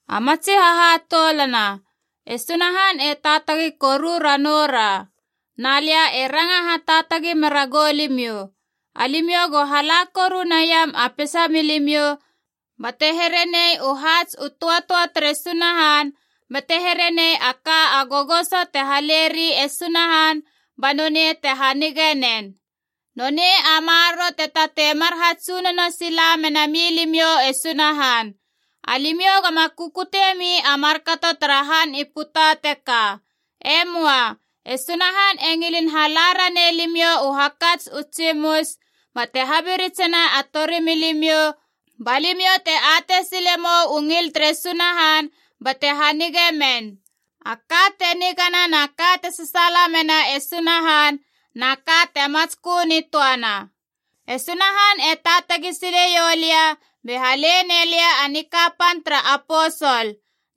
A matsi hahatoulana, e Sunahan e taatagi koru ranoura. Na lia e ranga hataatagi mera goulimiou, alimiou go hala koru naiam a peisa milimiou bate here nei u haats u tötöa tere Sunahan bate herenei a ka a gogoso te haleri e Sunahan ba nonei te hanigeie nen. Nonei a maroro te tatei mar hatsunono sila mena milimiou e Sunahan. Alimiou goma kukutiemi a markato tara han i puta teka. E möa. E Sunahan e ngilin hala ranei limiou u hakats u tsimus bate habiritsena a torimilimiou ba limiou te atei sile mou u ngil tere Sunahan bate hanigei men, a ka te nigana na ka te sasaala mena e Sunahan na ka te matskö nitöana. E Sunahan e taatagi sileiou lia be hale nei lia a nikapan tara aposol.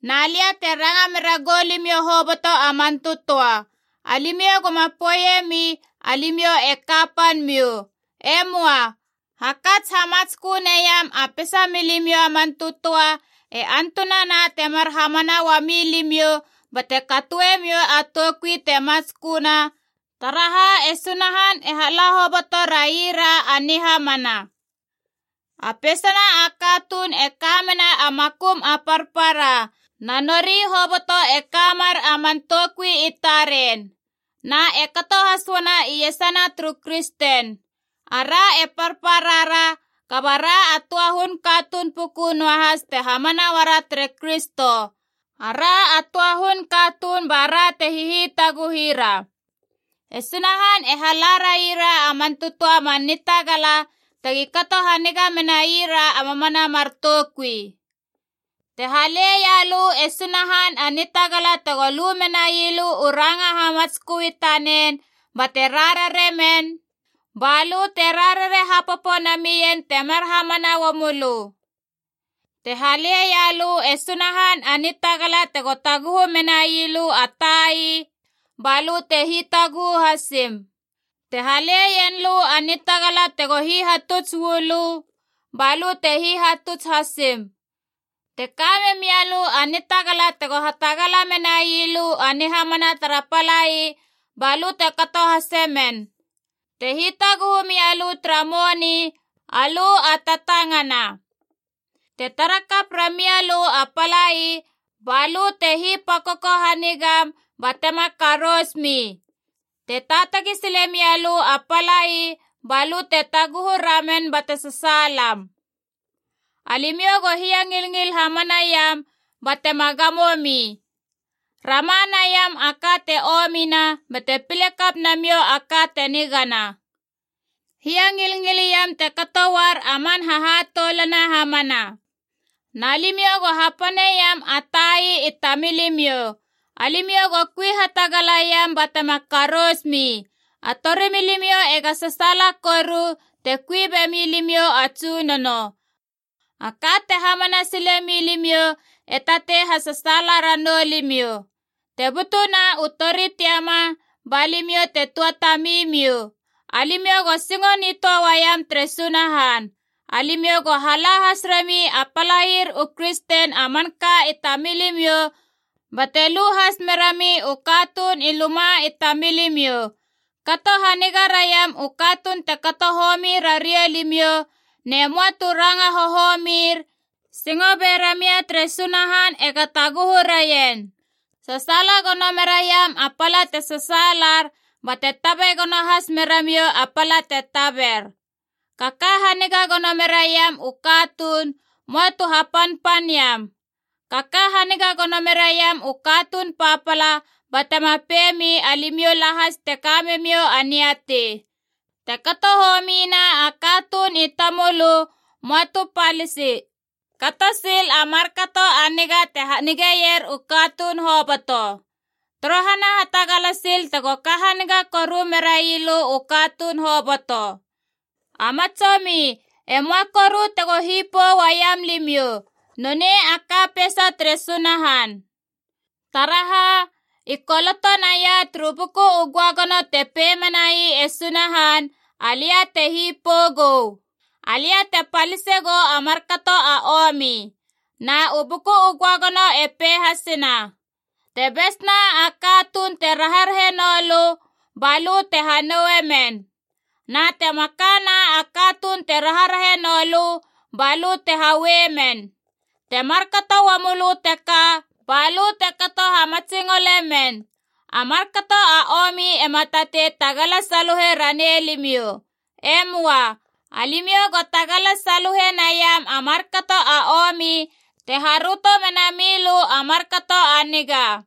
Na lia te ranga mera goulimiou hoboto a man tötöa, alimiou goma poeiemi alimiou e kapan miou. E möa. Hakats hamatskö naiam a peisa milimiou a man tötöa e antunana te mar hamana uami limiou, bate katoemiou a toukui te matsköna, taraha e Sunahan e hala hoboto raira a nihamana. A peisana a katuun e ka mena a makum a parpara, na nori hoboto e ka mer a man toukui i taren. Na e kato has uana iesana turu kristen. Ara e parpara ra kaba ra a töa hun katuun puku noahas te hamana uara tere Kristo. Ara a töa a hun katuun bara te hihitaguhira. E Sunahan e hala raira a man tötöa a man nitagala tegi kato haniga menai ra a mamana mar toukui. Te haleia lö e Sunahan a nitagala tego lu menai lö u ranga hamatskö i tanen bate rararie men, ba lö te rarare hapopo namien te mar hamana uamölö. Te haleia lö e Sunahan a nitagala tego taguhu menai lö a tai, balö te hitaguhu hasim. Te haleien lö a nitagala tego hihatuts uu lö, balö te hihatuts hasim. Te ka memia lö a nitagala tego hatagala menai lö a nihamana tara palai, balö te kato hasemen. Te hitaguhu mia lö tara moni, alö a tatangana. Te tara kap ramia lö a palai, ba lö te hipakoko hanigam batema karousmi. Te taatagi sile mia lö a palai, balö te taguhu ramen bate sasaalam. Alimiou go hiangilngil hamana iam ba tema gamo mi. Rama naiam a ka te omina bate pile kap namiou a ka te nigana. Hiangilngil iam te kato uar a man hahatoulana hamana. Na limiou go hapaneiam a tai i tamilimiou. Alimiou go kui hatagala iam batema karousmi. A torimilimiou ega sasaala koru te kui bemi limiou a Tsunono. A ka te hamana sile milimiou e tatei hasasaala ranou limiou. Te butuna u tori tiama, ba limiou te tuatamimiou. Alimiou go singo nitöa uaiam tere Sunahan. Alimiou go hala has rami a palair u kristen a manka i tamilimiou, bate lu has merami u katuun i luma i tamilimiou. Kato haniga raiam u katuun te kato homi rariou limiou, ne möa tu ranga hohomir, singo be ramia tere Sunahan ega taguhu raien. Sasaala gono me raiam a pala te sasaalar, bate tabe gono has meramiou a pala te taber. Kaka haniga gono meraiam u katuun, möa tu hapanpan iam. Kaka haniga gono meraiam u katuun papala, ba tema pei mi alimiou lahas te ka memiou a niatei. Te kato homina a katuun i tamölö, möa tu palisi. Kato sil a markato a niga te hanigeier u katuun hoboto. Torohana hatagala sil tego ka haniga koru merai lö u katuun hoboto. A matsomi, e möa koru tego hipou uaiam limiou. Nonei a ka peisa tere Sunahan. Taraha, i koloto naia turu Buku u Göagono te pei menai e Sunahan, “Alia te hipou gou. Alia te palise gou a markato a omi.” Na u Buku u Göagono e pei hasena: “Te besna a katuun te rarahe noulö, balö te hanoue men. Na te makana a katuun te rarahe noulö, balö te haue men. Te markato uamoulö teka, balö te kato hamatsingole men.” A markato a omi ema tatei tagala saluhe ranei limiou. E möa. Alimiou go tagala saluhe naiam a markato a omi te haröto menami lö a markato a niga.